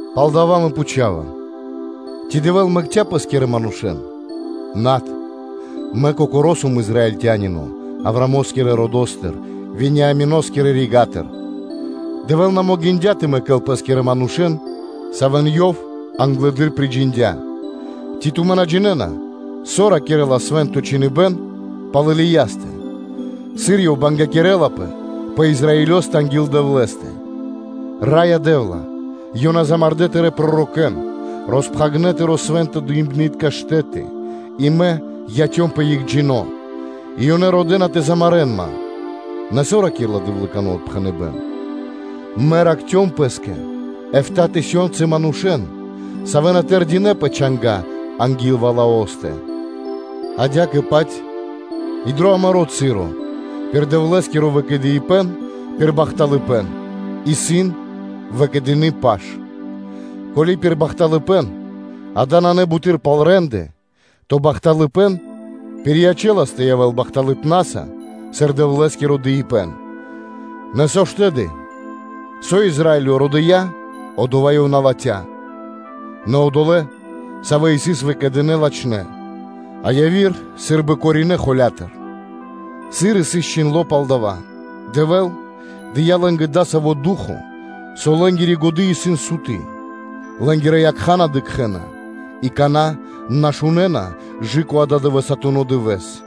Палдава́ мэ пхучава: “Ци Дэвэ́л мэкця́ Пэ́скирэ манушэ́н?” Над. Мэ кокоро́ сом Израильтянино, Авраамо́скирэ родо́стыр, Вениамино́скирэ рига́тыр. Дэвэ́л на могиндя́ тэ мэкэл Пэ́скирэ манушэ́н, савэ́н Ёв англэды́р приджиндя. Ци тумэ́ на джинэ́на, со ракирэ́ла Свэ́нто Чхиныбэ́н пал Илиястэ, сыр ёв тангинэлапэ (жалинэлапэ) пэ Израилё анги́л Дэвлэ́стэ? “Раё Дэ́вла! Ёнэ замардэ́ (умардэ) Тырэ́ пророкэ́н, роспхагирдэ́ Тырэ́ Свэнтонэ́-дыибнытка штэ́ты и мэ яцёмпэ екхджино́, и ёнэ родэ́на тэ замарэ́н ман.” Нэ со ракирэ́ла Дэвлыкано отпхэныбэ́н? “Мэ ракхцём Пэ́скэ эфта́ тысёнцы манушэ́н, савэ́ на тэрдинэ́ пэ чанга́ анги́л Ваалостэ.” Адя́кэ-паць и дро амаро́ часо пир Дэвлэ́скиро выкэдыибэн пир бахталыпэ́н исын выкэдыны паш. Ко́ли пир бахталыпэ́н-дава́ нанэ буты́р пал рэ́нды, то бахталыпэ́н пириячэлас тэ явэ́л бахталыпнаса, сыр Дэвлэ́скиро дыибэ́н. Нэ со ж тэды? Со Израилё родыя, одова́ ёв на латхья (ластя), нэ одолэ́, савэ́ сыс выкэдынэ́, латхнэ́, а яви́р сы́рбы короринэ холя́тыр. Сыр и сыс чхиндло́ пал дава́: “Дэвэ́л дыя́ лэ́нгэ дасаво ду́хо (фа́но), со лэ́нгири годы́ исын суты, лэ́нгирэ якха́ на дыкхэ́на и кана́ на шунэ́на кэ ададывэсатуно дывэ́с.”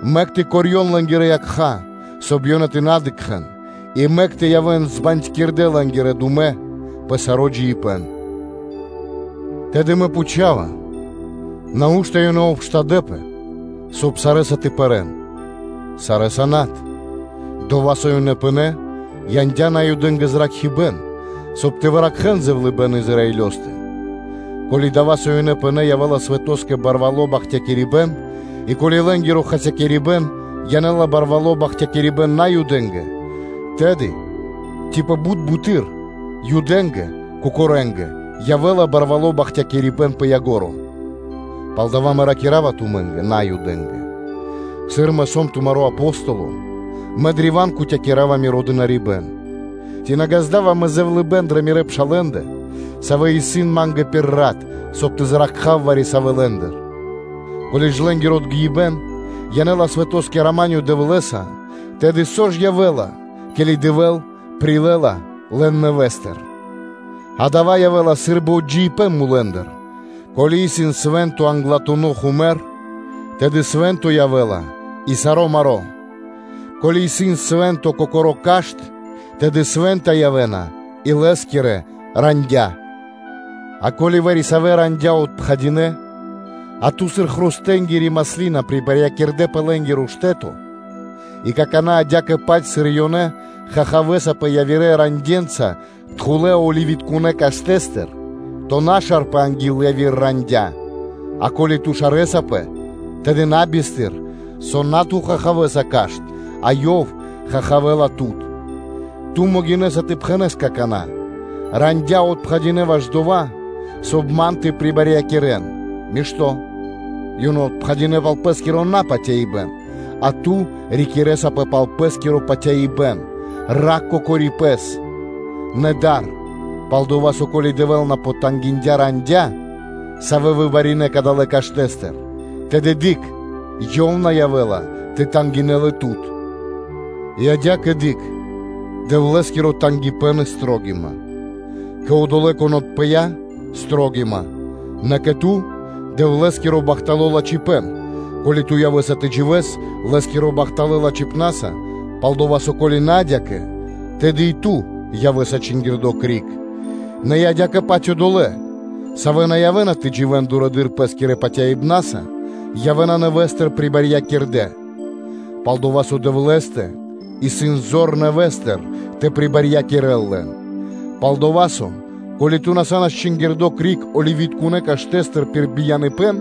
мэк тэ корьён лэ́нгирэ якха́, соб (кай) ёнэ тэ на дыкхэ́н, и мэк тэ явэ́н збандькирдэ лэ́нгирэ думэ пэ саро́ джиибэ́н.” Тэды мэ пхучава: Нау́што ёнэ обштадэпэ, соб (кай) сарэ́са тэ пэрэ́н? Сарэ́са над: Дова́, со ёнэ пынэ́, яндя́ Наюдэ́нгэ зракхибэ́н, соб (кай) тэ выкхарэн зэвлыныпэ́н дро Израилё. Ко́ли дава́, со ёнэ пынэ́, янэ́ла свэтоскэ барвало́ бахтякирибэ́н, и ко́ли лэ́нгиро хасякирибэн янэ́ла барвало́ бахтякирибэ́н Наюдэ́нгэ, тэды ци пэ бут буты́р Юдэ́нгэ кокорэндэ явэ́ла барвало́ бахтякирибэ́н пэ ко́нцо (пэ яго́ро). Палдава́ мэ ракира́ва, тумэ́нгэ, Наюдэ́нгэ: сыр мэ сом тумаро́ Апостоло, мэ древа́н кутякирава миро дынарибэ́н (служэниё); ци на ґазда́ва мэ зэвлыныпэ́н дрэ мирэ́ пшалэ́ндэ, савэ́ исын ма́нгэ пир рат, соб (кай) тэ зракхав вари-савэ́ лэ́ндыр? Ко́ли лэ́нгиро отгиибэн янэ́ла свэтоскэ рама́нё (миро) Дэвлэ́са, тэды со ж явэ́ла, ке́ли Дэвэ́л прилэ́ла лэн нэвэ́стыр? А дава́ явэ́ла сы́рбы отджидыибэн мулэ́ндыр. Ко́ли исын свэ́нто англатуно́ хумэр (тясто), тэды свэ́нто явэ́ла и саро́ маро́. Ко́ли исын свэ́нто кокоро́ кашт (дрэ́во), тэды свэ́нта явэ́на и лэ́скирэ рандя́ (вэ́тки). А ко́ли вари-савэ́ рандя́ отпхадинэ, а тут сыр хрустэнгири маслина прибарьякирды пэ лэ́нгиро штэ́то, и какана́ адя́кэ-паць, сыр и ёнэ, ту чаравэ́саспэ (хахавэ́саспэ) явирэ ранде́нца тхулэ́-оливитконэ́ каштэ́стыр, то на шарпэ анги́л яви́р рандя́; а ко́ли ту шарэсапэ, тэды на бистыр, со на ту чаравэса (хахавэ́са) кашт, а ёв хахавэла тут. Ту могинэ́са тэ пхэнэ́с какана́: “Рандя́ отпхадинэ ваш дова́, соб (кай) ман тэ прибарьякирэн.” Мишто́: ёнэ отпхадинэ пал пэ́скиро напатяибэн, а ту рикирэсапэ пал пэ́скиро патяибэ́н. Ракх кокори пэс, нэ дар: пал-дова́ со, ко́ли Дэвэ́л на потангиндя ранден, савэ́ выбаринэ кадалэ́ каштэ́стыр, тэды дыкх, Ёв на явэ́ла тэ тангинэ́л и тут. И адя́кэ, дыкх Дэвлэ́скиро тангипэ́н и строгима: кэ одолэ́, кон отпыя, – строгима, нэ кэ ту – Дэвлэ́скиро бахтало́ лачхипэ́н, ко́ли ту явэ́са тэ дживэ́с Лэ́скирэ бахталэ́ лачхипна́са, пал-дова́ со, ко́ли на адя́кэ, тэды и ту явэ́са чингирдо криг. Нэ и адя́кэ-паць одолэ́, савэ́ на явэ́на тэ дживэ́н дурэды́р пэ́скирэ патяибна́са, явэ́на нэвэ́стыр прибарьякирдэ; пал-дова́ со Дэвлэ́стэ исын зор нэвэ́стыр тэ прибарьякирэл лэн. Палдава́ со, ко́ли ту са́нас чингирдо криг оливитконэ́ каштэ́стыр пир бияныпэ́н,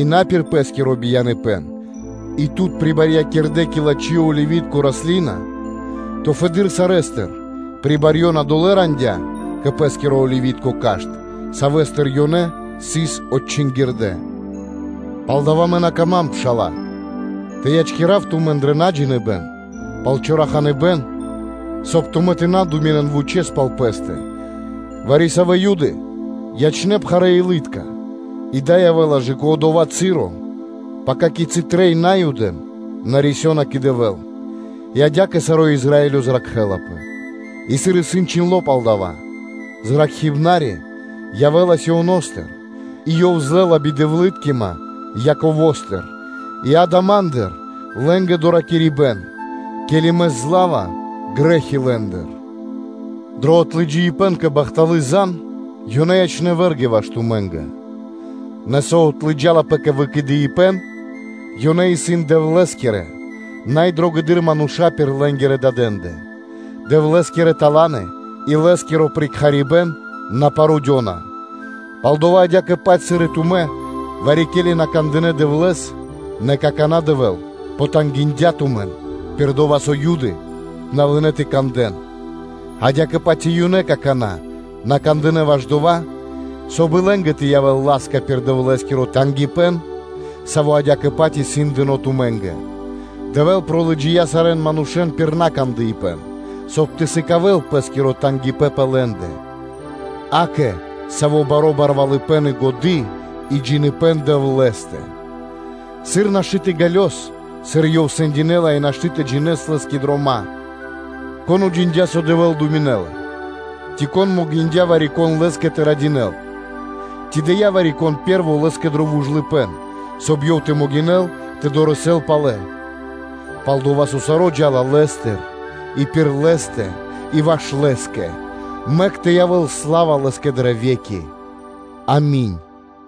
и на пир пэ́скиро бияныпэ́н, и тут прибарьякирдэ кэ лачхи́ оливи́тко раслина, то фэды́р сарэ́стыр прибарьёна долэ́ рандя́ кэ пэ́скиро оливи́тко кашт (дрэ́во), савэ́стыр ёнэ сыс отчингирдэ. Палдава́ мэ на кама́м, пшала́лэ, тэ ячкирав тумэн дрэ наджиныбэн пал чораханыбэн, соб (кай) тумэ́ тэ на думинэн вучэ́с пал пэ́стэ, вари-савэ́ Юды ячнэ́ пхарэилытка и дава́ явэ́ла кэ одова́ часо, пака, кицы́ трэй Наюдэн, рисёна кэ Дэвэ́л; и адя́кэ саро́ Израилё зракхэ́лапэ. И сыр исын чхиндло́ пал дава́: “Зракхибнари явэ́ла Сионо́стыр; и Ёв отрискирэла бидэвлыткима Яковостыр. И дава́ Ма́ндыр лэ́нгэ доракирибэ́н, ке́ли Мэ злава грэ́хи лэ́ндыр.” Дро отлыджаибэн кэ бахталы́ зан (звесь), ёнэ ячнэ́ вэргэнца ваш тумэ́нгэ; нэ со отлыджалапэ кэ выкэдыибэн, ёнэ исын Дэвлэ́скирэ най дрогэдыр мануша́ пир лэ́нгирэ дадэндэ. Дэвлэ́скирэ таланы и Лэ́скиро прикхарибэн на парудёна. Палдава́ адя́кэ-паць, сыр и тумэ́ вари-ке́ли на кандынэ́ Дэвлэ́с, нэ какана́ Дэвэ́л потангиндя тумэн, пир дова́ со Юды на лынэ́ тэ кандэ́н, адя́кэ-паць и ёнэ какана́ на кандынэ́ ваш дова́, соб (кай) и лэ́нгэ тэ явэ́л ла́ска пир Дэвлэ́скиро тангипэ́н, саво́ адя́кэ-паць сыс дыно́ тумэ́нгэ. Дэвэ́л пролыджия сарэ́н манушэ́н пир накандыпэн, соб (кай) тэ сыкавэ́л Пэ́скиро тангипэ́н пэ лэ́ндэ. Акэ, саво́ баро́ барвалыпэ́н и годы́, и джиныбэ́н Дэвлэ́стэ! Сыр нашты́ тэ ґалёс, сыр Ёв сэндинэла и нашты́ тэ джинэ́с Лэ́скирэ дрома́! Кон уджиндя́, со Дэвэ́л думинэ́ла? Ци могиндя́ вари-кон Лэ́скэ тэ радинэл? Ци дыя́ вари-кон пэ́рво Лэ́скэ дро вужлыпэ́н, соб (кай) ёв тэ могинэл тэ дорэсэл (тэ долэл) палэ? Пал-дова́ со саро́ джа́ла Лэ́стыр и пир Лэ́стэ и ваш Лэ́скэ. Мэк тэ явэ́л сла́ва Лэ́скэ дрэ ве́ки! Ами́нь.